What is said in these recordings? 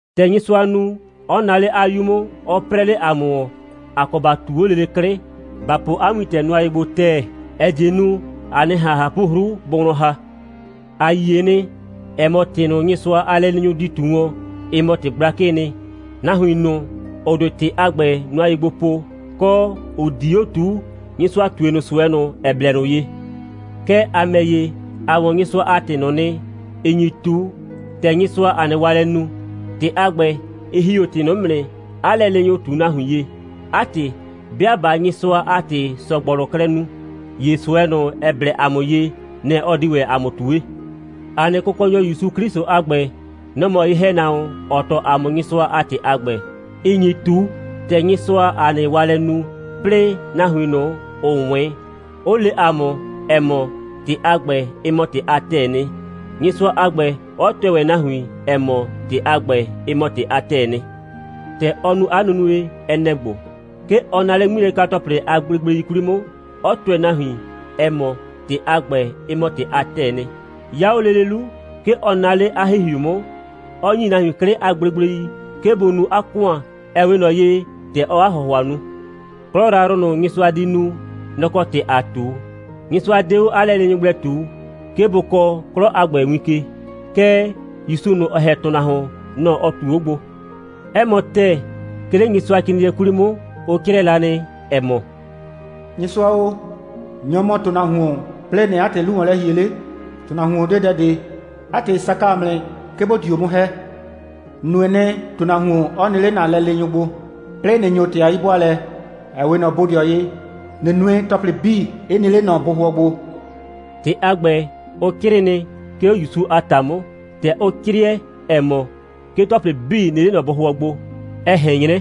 ‑Tɛ Nyɩsʋa nu, 'ɔ naa 'le 'a 'Yu 'mʋ, 'ɔ 'prɛɛ 'le ‑a mʋ ‑wɔn, ‑a kɔ ‑ba ꞊tu 'o lele 'klɩ, ‑ba po 'a wintɛ nʋa ye gbo ‑tɛɛ, ‑ɛ die nu, ‑a 'nɩ ꞊han ꞊hapʋ'hru bʋ wlɔn ‑ha. ‑A yie nɩ, ‑ɛ mɔ, ‑tɩ ꞊nʋ, Nyɩsʋa a lɛleenyʋ di ꞊tu wɔn, ɩ mɔ ‑tɩ gblakɩɩ nɩ. Nahuin ꞊nʋ, ‑ʋ 'de ‑tɩ a ‑gbɛ nʋa ye gbo po, kɔ, ‑ʋ 'di 'o ꞊tuu, Nyɩsʋa ꞊tue ꞊nʋ ꞊sʋɛ ꞊nʋ, ‑ɛ blɛ ꞊nʋ ye. Kɛɛ, ‑a ‑mɛ ‑ye, ‑a 'wɔn Nyɩsʋa a ‑tɩ ꞊nʋ nɩ, ‑ɩ nyi ꞊tu, ‑tɛ Nyɩsʋaa ‑a nɩ waalɛ nu. ‑Tɩ a ‑gbɛ, ɩ ‑hi 'o ‑tɩ ꞊nʋ 'mʋ nɩ, 'a lɛleenyʋ ꞊tu nahuin ye. 'A ‑tɩ, 'bɩa ꞊baa Nyɩsʋa a ‑tɩ ‑sɔgbɔlʋ klɛ nu, ‑ye ꞊sʋɛ ꞊nʋ, ‑ɛ blɛ ‑a mʋ ye, nɛ‑ ɔ di ‑wɛ ‑a mʋ ꞊tue. ‑A nɩ Kʋkɔnyɔ ‑Yusu 'Klɩsʋ a ‑gbɛ, nɔ‑ mɔ ye‑hɛnahuon, ‑ɔ tɔɔ ‑a mʋ Nyɩsʋa a ‑tɩ a ‑gbɛ, ‑ɩ nyi ꞊tu, ‑tɛ Nyɩsʋaa ‑a nɩ waalɛ nu, 'plɩɩ nahuin ꞊nʋ, ‑ʋ 'wɩn, 'ʋ le ‑a mʋ, ‑ɛ mɔ, ‑tɩ a ‑gbɛ, ɩ mɔ ‑tɩ a ‑tɛɛ nɩ, Nyɩsʋa a ‑gbɛ, 'ɔ tʋɛ ‑wɛ nahuin, ‑ɛ mɔ, ‑tɩ a ‑gbɛ, ɩ mɔ ‑tɩ a ‑tɛɛ nɩ. ‑Tɛ ɔ nu 'a nunue, ɛ nɛ‑ ‑gbo: 'Ke ɔ naa 'le 'ŋmilɛka‑tɔplɩ a gblegblei 'kwli 'mʋ, 'ɔ tʋɛ nahuin, ‑ɛ mɔ, ‑tɩ a ‑gbɛ, ɩ mɔ ‑tɩ a ‑tɛɛ nɩ. 'Ya 'o lele 'lu, 'ke ɔ naa 'le 'a ‑Hihiu 'mʋ, 'ɔ ‑nyi nahuin 'klɩ a gblegblei, 'ke bʋ nu 'a ‑kʋan, ‑ɛ 'we ꞊nɔ ye, ‑tɛ ɔɔ 'a ‑hʋhʋa nu. 'Klɔ yrayrʋ ꞊nʋ, Nyɩsʋa di nu, nɔ‑ kɔ ‑tɩ ‑aa ꞊tu. Nyɩsʋa 'de 'o 'a lɛleenyʋ gblɛ ꞊tu, 'ke bʋ kɔɔ 'klɔ a ‑gbɛ win ke. Kɛɛ, ‑Yusu ꞊nʋ, ‑ɔ ‑hɛ ‑tʋnahuon, nɔ‑ ɔ ꞊tu 'o gbo. 'Ɛ mɔ ‑tɛɛ, 'ke 'le Nyɩsʋacrɩɩnɩɛ 'kwli 'mʋ, ʋ 'crɩɛ la nɩ, ‑ɛ mɔ: «Nyɩsʋa o, nyɔ‑ mɔ ‑tʋnahuon, 'plɩɩ ꞊nɩɩ 'a ‑tɩ 'lu ‑wɔn lɛ ‑hie 'le? ‑Tʋnahuon 'de dɛ ꞊de. 'A ‑tɩ, ɩ saka ‑a mʋ nɩ, 'ke ‑bo dio 'mʋ ‑hɛ. ‑N nue nɩ, ‑tʋnahuon 'ɔ nɩ 'le ‑na lɛleenyʋ bʋ gbo, 'plɩɩ ꞊nɩ ‑nyo ‑tɩ a 'yi'bʋaalɛ, ‑ɛ 'we ꞊nɔ bodɩɔ ye, ꞊nɩ nue, ‑tɔplɩ 'bii 'ɩ nɩ 'le ꞊nɔ bʋhʋɔ gbo.» ‑Tɩ a ‑gbɛ, ʋ 'crɩɩ nɩ, 'ke 'o ‑Yusu a ‑ta 'mʋ. ‑Tɛ ʋ 'crɩɛ, ‑ɛ mɔ: «'Ke ‑tɔplɩ 'bii nɩ 'le ꞊nɔ bʋhʋɔ gbo,» ɛ ꞊hɛn 'nyrɛ,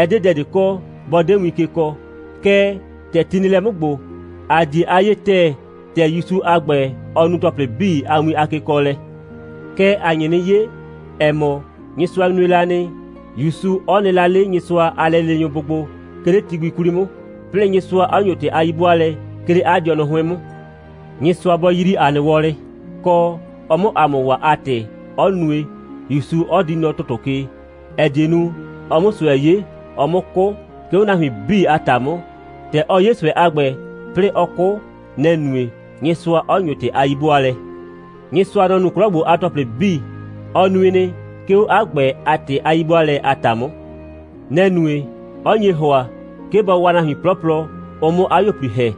ɛ 'de dɛ ꞊de kɔ, bɔ 'de win ke kɔɔ. Kɛɛ, ‑tɛ ti nɩ lɛ 'mʋ ‑gbo, ‑a 'die a 'yee ‑tɛɛ, ‑tɛ ‑Yusu a ‑gbɛ, ɔ nu ‑tɔplɩ 'bii a win a kekɔɔlɛ. Kɛɛ, ‑a nye 'nɩ 'ye, ‑ɛ mɔ, Nyɩsʋa nue la nɩ, ‑Yusu 'ɔ nɩ la 'le Nyɩsʋa a lɛleenyʋ bʋ gbo, 'ke 'le ti gbi 'kwli 'mʋ, 'plɩɩ Nyɩsʋa 'ɔ ‑nyo ‑tɩ a 'yi'bʋaalɛ, 'ke 'le 'a dɩɔnʋ 'hʋɩn 'mʋ. Nyɩsʋa bɔ yrii ‑a nɩ wɔlɩ, kɔ, ɔ 'mʋ ‑a mʋ waa a ‑tɩ, 'ɔ nue, ‑Yusu 'ɔ di nɔ ‑tʋtʋ ke, ‑ɛ die nu, ɔ 'mʋ ꞊sʋɛ 'ye, ɔ 'mʋ 'kʋ, 'ke 'o nahuin 'bii a ‑ta 'mʋ. ‑Tɛ ɔ 'ye ꞊sʋɛ a ‑gbɛ, 'plɩɩ ɔ 'kʋ, nɛ‑ nue, Nyɩsʋa 'ɔ ‑nyo ‑tɩ a 'yi'bʋaalɛ. Nyɩsʋa, nɔ‑ nu 'klɔ ‑gbo a ‑tɔplɩ 'bii. Ɔ nui nɩ, 'ke 'o 'a ‑gbɛ a ‑tɩ a 'yi'bʋaalɛ a ‑ta 'mʋ. Nɛ‑ nue, 'ɔ nye ‑hʋa, 'ke bɔ waa nahuin 'plɔplɔ, ʋ 'mʋ 'a 'yuo꞊pli ‑hɛ,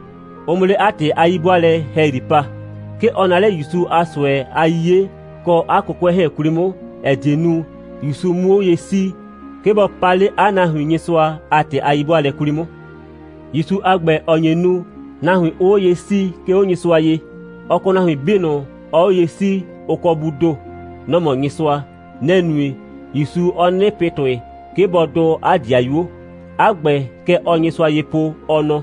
ʋ 'mʋ 'le 'a ‑tɩ a 'yi'bʋaalɛ ‑hɛyri pa. 'Ke ɔ naa 'le ‑Yusu a ꞊sʋɛ a 'yiye kɔ 'a 'kʋkʋɛ 'hɛɛn 'kwli 'mʋ, ‑ɛ die nu, ‑Yusu 'mʋ 'o ye 'sii, 'ke bɔ paa 'le 'a nahuin Nyɩsʋa a ‑tɩ a 'yi'bʋaalɛ 'kwli 'mʋ. ‑Yusu a ‑gbɛ, ‑ɔ nye nu, nahuin 'ʋʋ 'o ye 'sii, 'ke 'o Nyɩsʋa ye, ɔ kɔ nahuin 'bii ꞊nʋ, ɔɔ 'o ye 'sii, ʋ kɔ Buu ‑do. Nɔ‑ mɔ Nyɩsʋa. Nɛ‑ nue, ‑Yusu 'ɔ 'nɩnɩ pɩ ‑tʋɩ, 'ke bɔ dʋʋ 'a ‑dɩayuo. 'A ‑gbɛ, kɛ ɔɔ Nyɩsʋa ye po, ɔ nɔ: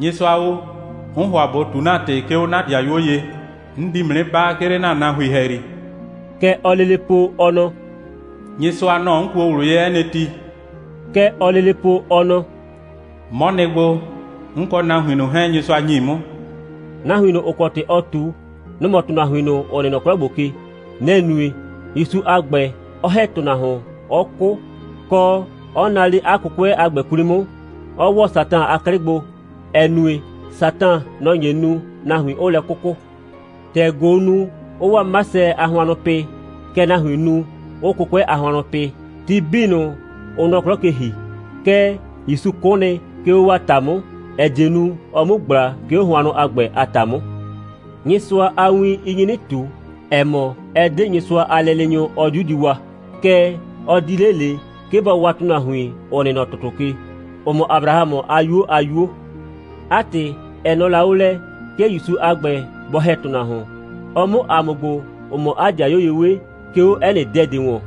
«Nyɩsʋa o, 'n ‑hʋa ꞊bo ꞊tu ‑na ‑tɩ, 'ke 'o 'na 'dɩayuo ye. 'N di ‑mʋ 'nɩ baa, 'ke 'le ‑na nahuin ‑hɛyri.» Kɛ ɔɔ lele po, ɔ nɔ: «Nyɩsʋa, nɔ‑ 'n kuo ꞊wlʋ ye 'ɛ nɩ ti.» Kɛ ɔɔ lele po, ɔ nɔ: «'Mɔ nɩ gbo, 'n kɔ nahuin ꞊nʋ 'hɛɛn, Nyɩsʋa ‑nyi 'mʋ.» Nahuin ꞊nʋ, ‑ʋ kɔ ‑tɩ ɔɔ ꞊tu, nʋ‑ mɔ ‑tʋnahuin ꞊nʋ, ‑ʋ nɩ nɔ 'klɔ ‑gbo ke. Nɛ‑ nue, ‑Yusu a ‑gbɛ, 'ɔ ‑hɛ ‑tʋnahuon, 'ɔ 'kʋ, kɔ, 'ɔ naa 'le 'a 'kʋkʋɛ a ‑gbɛ 'kwli 'mʋ, 'ɔ ‑wɔ Satan a 'klɩ gbo, ‑ɛ nue, Satan, nɔ‑ nye nu, nahuin 'ʋʋ lɛ 'kʋkʋ. ‑Tɛ ꞊goo nu, 'ɔɔ 'waa 'masɛ a hʋannʋ pɩ, kɛ nahuiin nu, 'ʋʋ 'kʋkʋɛ a hʋannʋ pɩ, ti 'bii ꞊nʋ, ʋʋ nɔ 'klɔ ke ‑hi. Kɛɛ, ‑Yusu 'kʋ nɩ, 'ke 'o 'waa ‑ta 'mʋ, ‑ɛ die nu, ɔ 'mu ꞊gbla, 'ke 'o hʋannʋ a ‑gbɛ a ‑ta 'mʋ. Nyɩsʋa a win, ɩ nyi 'nɩ ꞊tu, ‑ɛ mɔ, ɛ 'de Nyɩsʋa a lɛleenyʋ, ɔ 'diu di waa, kɛɛ, ɔ di 'le ꞊le, 'ke bɔ waa ‑tʋnahuin, ‑ʋ nɩ nɔ ‑tʋtʋ ke, ‑ʋ mɔ Abrahamʋ a 'yuo a 'yuo. 'A ‑tɩ, ɛ nɔɔ la 'o lɛ, 'ke ‑Yusu a ‑gbɛ, bɔ ‑hɛ ‑tʋnahuon, ɔ 'mʋ ‑a mɔ ‑gbo, ‑ʋ mɔ 'a 'dɩayuo ye 'we, 'ke 'o 'ɛ nɩ dɛ ꞊de ‑wɔn.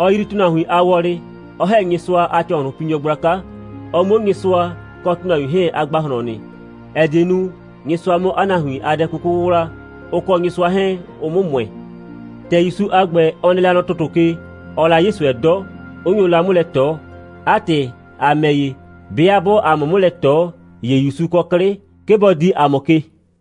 Ɔ yrii ‑tʋnahuin a wɔlɩ, 'ɔ ‑hɛ Nyɩsʋa a ‑cɔhlʋnpinyɔ gblaka, ɔ 'mʋ 'o Nyɩsʋa kɔ ‑tʋnahuin 'hɛɛn a ‑gbahlɔn nɩ, ‑ɛ die nu, Nyɩsʋa 'mʋ 'a nahuin a dɛ 'kuku 'wʋwla, ʋ kɔ Nyɩsʋa 'hɛɛn, ʋ 'mʋ ‑mʋɛ. ‑Tɛ ‑Yusu a ‑gbɛ, ɔ nɩ la nɔ ‑tʋtʋ ke, ɔɔ la 'ye ꞊sʋɛ 'dɔ, 'ʋ nyo la 'mʋ lɛ ꞊tɔ. 'A ‑tɩ, ‑a ‑mɛ ‑ye, 'bɩa 'bʋʋ ‑a mʋ 'mʋ lɛ ꞊tɔ, ‑ye ‑Yusu kɔ 'klɩ, 'ke bɔ dii ‑a mʋ ke.